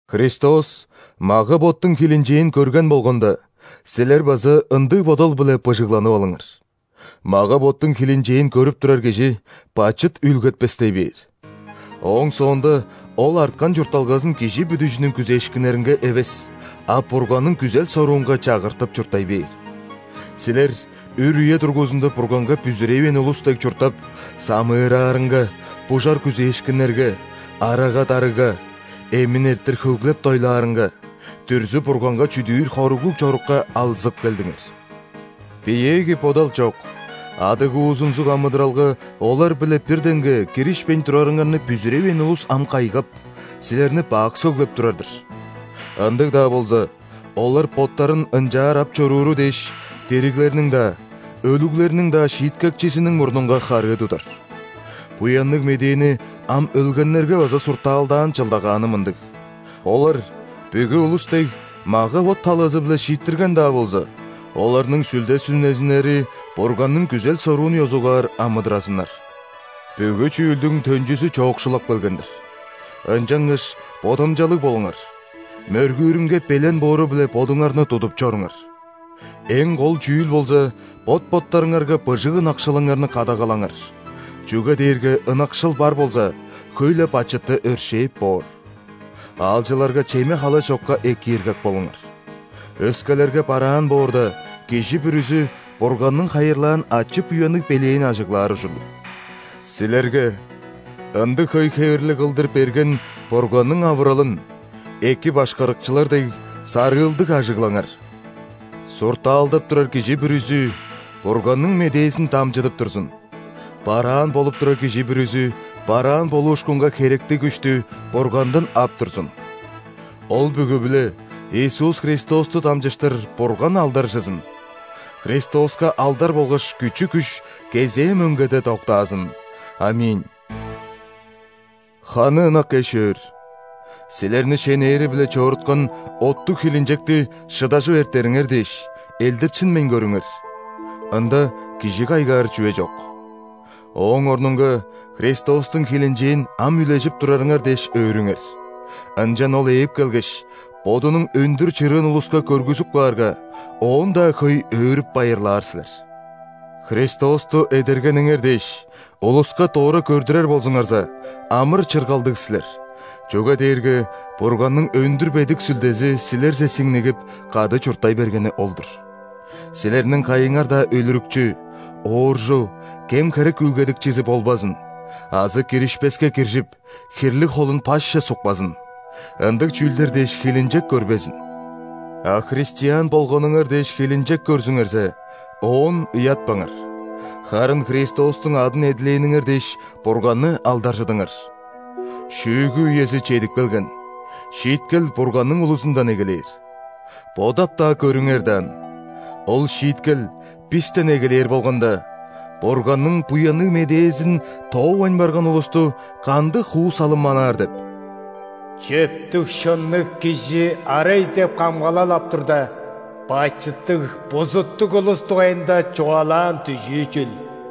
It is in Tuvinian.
Христос мага-боттуң хилинчээн көрген болганда, силер база ындыг бодал-биле быжыгланып алыңар. Мага-боттуң хилинчээн көрүп турар кижи бачыт үүлгетпестей бээр. Ооң соонда ол арткан чуртталгазын кижи бүдүжүнүң күзээшкиннеринге эвес, а Бурганның күзел-соруунга чагыртып чурттай бээр. Силер үр үе дургузунда Бурганга бүзүревээн улус дег чурттап, самыыраарынга, бужар күзээшкиннерге, арага-дарыга, эмин эрттир хөглеп-дойлаарынга, дүрзү-бурганга чүдүүр хоруглуг чорукка алзып келдиңер. Биеэги бодал чок, адыгуузунзуг амыдыралга олар-биле бир деңге киришпейн турарыңарны бүзүревээн улус ам кайгап, силерни бак сөглеп турар-дыр. Ындыг-даа болза, олар боттарын ынчаар ап чорууру дээш, дириглерниң-даа, өлүглерниң-даа Шииткекчизиниң мурнунга харыы тудар. (Буянныг Медээни ам өлгеннерге база сурталдаан чылдагааны мындыг: олар, бүгү улус дег, мага-бот талазы-биле шииттирген-даа болза, оларның сүлде-сүнезиннери Бурганның күзел-соруун ёзугаар амыдыразыннар.) Бүгү чүүлдүң төнчүзү чоокшулап келген-дир. Ынчангаш бодамчалыг болуңар, мөргүүрүнге белен боору-биле бодуңарны тудуп чоруңар. Эң кол чүүл болза, бот-боттарыңарга быжыг ынакшылыңарны кадагалаңар, чүге дээрге ынакшыл бар болза, хөй-ле бачытты өршээп боор. Аалчыларга чеме-хала чокка экииргек болуңар. Өскелерге бараан боорда, кижи бүрүзү Бурганның хайырлаан ачы-буянныг белээн ажыглаар ужурлуг. Силерге ындыг хөй хевирлиг кылдыр берген Бурганның авыралын, эки башкарыкчылар дег, сарыылдыг ажыглаңар: суртаалдап турар кижи бүрүзү Бурганның медээзин дамчыдып турзун, бараан болуп турар кижи бүрүзү бараан болуушкунга херектиг күштү Бургандан ап турзун. Ол бүгү-биле Иисус Христосту дамчыштыр Бурган алдаржызын. Христоска алдар болгаш күчү-күш кезээ мөңгеде доктаазын! ·Аминь. Ханы ынак эш-өөр, силерни шенээри-биле чоруткан оттуг хилинчекти шыдажып эртериңер дээш, элдепсинмейн көрүңер. Ында кижи кайгаар чүве чок. Ооң орнунга Христостуң хилинчээн ам үлежип турарыңар дээш өөрүңер, ынчан Ол ээп келгеш, Бодунуң өндүр чырыын улуска көргүзүп каарга, оон-даа хөй өөрүп-байырлаар силер. Христосту эдергениңер дээш, улуска дора көрдүрер болзуңарза, амыр-чыргалдыг силер, чүге дээрге Бурганның өндүр бедик Сүлдези силерже сиңнигип, кады чурттай бергени ол-дур. Силерниң кайыңар-даа өлүрүкчү, ооржу, кем-херек үүлгедикчизи болбазын азы киришпеске киржип, хирлиг холун пашче сукпазын – ындыг чүүлдер дээш хилинчек көрбезин. А христиан болганыңар дээш хилинчек көрзүңерзе, оон ыятпаңар, харын Христостуң адын эдилээниңер дээш, Бурганны алдаржыдыңар. Шүүгү үези чедип келген, шииткел Бурганның улузундан эгелээр. Бодап-даа көрүңер даан, ол шииткел бистен эгелээр болганда, Бурганның Буянныг Медээзин тоовайн барган улусту кандыг хуу-салым манаар деп?! Чөптүг-шынныг кижи арай деп камгалал ап турда,бачыттыг, бузуттуг улус дугайында чугаалаан дүжүү чүл?